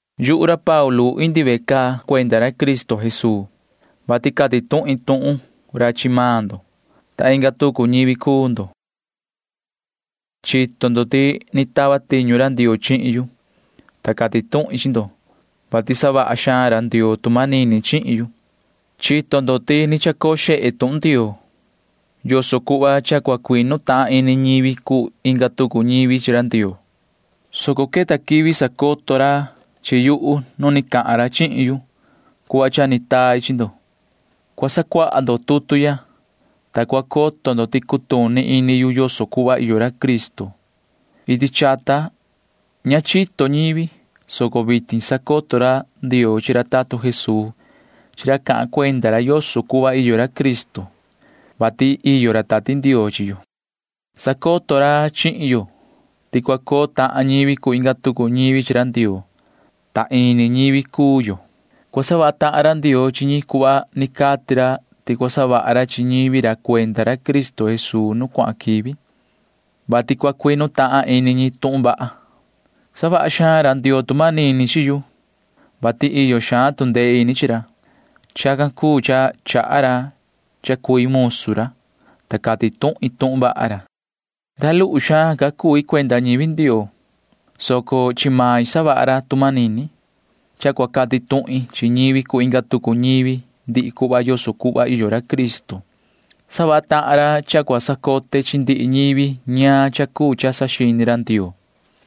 Yuhu ra Paulu indi ve caa ya cuenda ra Cristo Jesuu, vati cati tuhin tuhun ra chi maan ndo, ta inga tucu ñivi cuu ndo. Chito ndo ti ni tava tiñu ra Ndioo chihin yu, ta cati tuhin chi ndo, vati savaha xaan ra Ndioo tu manini chihin yu. Chito ndo ti ni chacoo xehe tuhun Ndioo [yoso cuhva cha cua cuinu tahan ini ñivi cuu inga tucu ñivi chi ra Ndioo], soco queta quivi sacoto ra chi yuhu nu ni cahan ra chihin yu cuhva cha ni tai chi ndo. Cua sacuaha ndo tutu ya, ta cua coto ndo ti cutuni ini yu yoso cuhva iyo ra Cristo. Iti chata ña chito ñivi, soco vitin sacoto ra Ndioo chi ra tatun Jesuu chi ra cahan cuenda ra yoso cuhva iyo ra Cristo, vati iyo ra Tati Ndioo chi yo. Sacoto ra chihin yo ti cua coo tahan ñivi cuu inga tucu ñivi chi ra Ndioo, ta ini ñivi cuu yo. Cua savaha tahan ra Ndioo chi ñi cuhva ni cati ra ti cua savaha ra chi ñivi ra cuenda ra Cristo Jesuu nu cuahan quivi, vati cua cuinu tahan ini ñi tuhun vaha. Savaha xaan ra Ndioo tu manini chi yu, vati iyo xaan tu ndee ini chi ra. Chacan cuu cha chaha ra cha cui musu ra, ta cati tuhin tuhun vaha ra. Ra luhu xaan ca cui cuenda ñivi Ndioo, soco chi main savaha ra tu manini cha cua cati tuhin chi ñivi cuu inga tucu ñivi ndihi cuhva yoso cuhva iyo ra Cristo. Savaha tahan ra cha cua sacote chi ndihi ñivi ñaan cha cuu cha saxini ra Ndioo,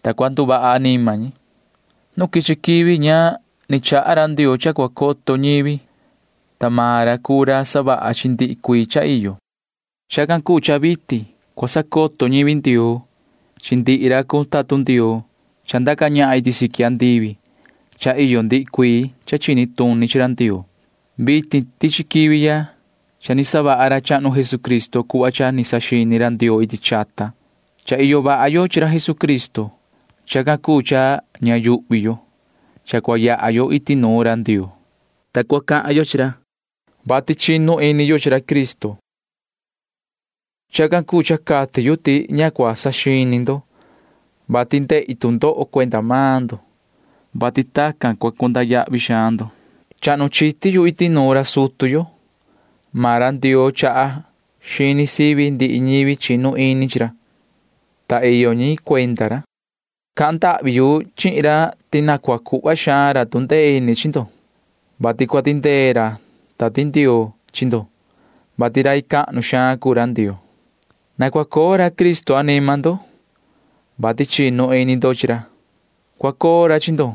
ta cua nduvaha anima ñi. Nu quichi quivi ña ni chaha ra Ndioo cha cua coto ñivi, ta maan ra cuu ra savaha chi ndihi cuii cha iyo. Chacan cuu cha vitin cua sacoto ñivi Ndioo chi ndihi ra cuu tatun Ndioo cha ndaca ñahan iti siqui andivi ti cha iyo ndihi cuii cha chini tuni chi ra Ndioo. Vitin tichi quivi ya cha ni savaha ra chahnu Jesucristo cuhva cha ni saxini ra Ndioo iti chata. Cha iyo vaha yo chi ra Jesucristo. Chacan cuu cha ña yuhvi yo cha cua yaha yo iti nuun ra Ndioo, ta cua cahan yo chi ra, vati chinu ini yo chi ra Cristo. Chacan cuu cha cati yu ti ña cua saxini ndo, vati ndehi tu ndoho cuenda maan ndo, vati tacan ni cua cuu ndo ñivi cahnu xaan. Chahnu chiti yu iti nuun ra sutu yo. Maan ra Ndioo chaha xini sivi ñi chi ndihi ñivi chinu ini chi ra, ta iyo ñi cuenda ra. Cahan ndahvi yu chihin ra ti na cua cuhva xaan ra tu ndee ini chi ndo, vati cua tindee ra Tati Ndioo chi ndo, vati rai cahnu xaan cuu ra Ndioo. Na cua coo ra Cristo anima ndo, vati chinu ini ndo chi ra. Cua coo ra chi ndo,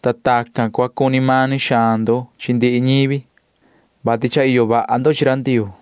ta tacan ni cua cuni mani xaan ndo chi ndihi ñivi, vati cha iyo vaha ndo chi ra Ndioo.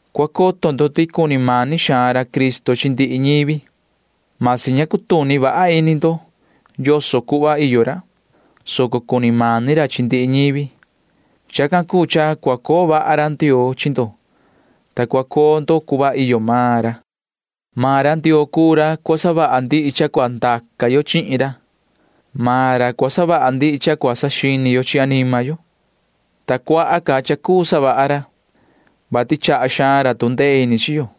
Cua coto ndo ti cuni mani xaan ra Cristo chi ndihi ñivi. Vasi ña cua cutuni vaha ini ndo yoso cuhva iyo ra, soco cuni mani ra chi ndihi ñivi. Chacan cuu cha cua coo vaha ra Ndioo chi ndo, ta cua cuu ndo cuhva iyo maan ra. Maan ra Ndioo cuu ra cua cuu savaha ndihi cha cua ndaca yo chihin ra. Maan ra cua savaha ndihi cha cua saxini yo chi anima yo, ta cuaha xaan ca cua savaha ra, vati chaha xaan ra tu ndee ini chi yo.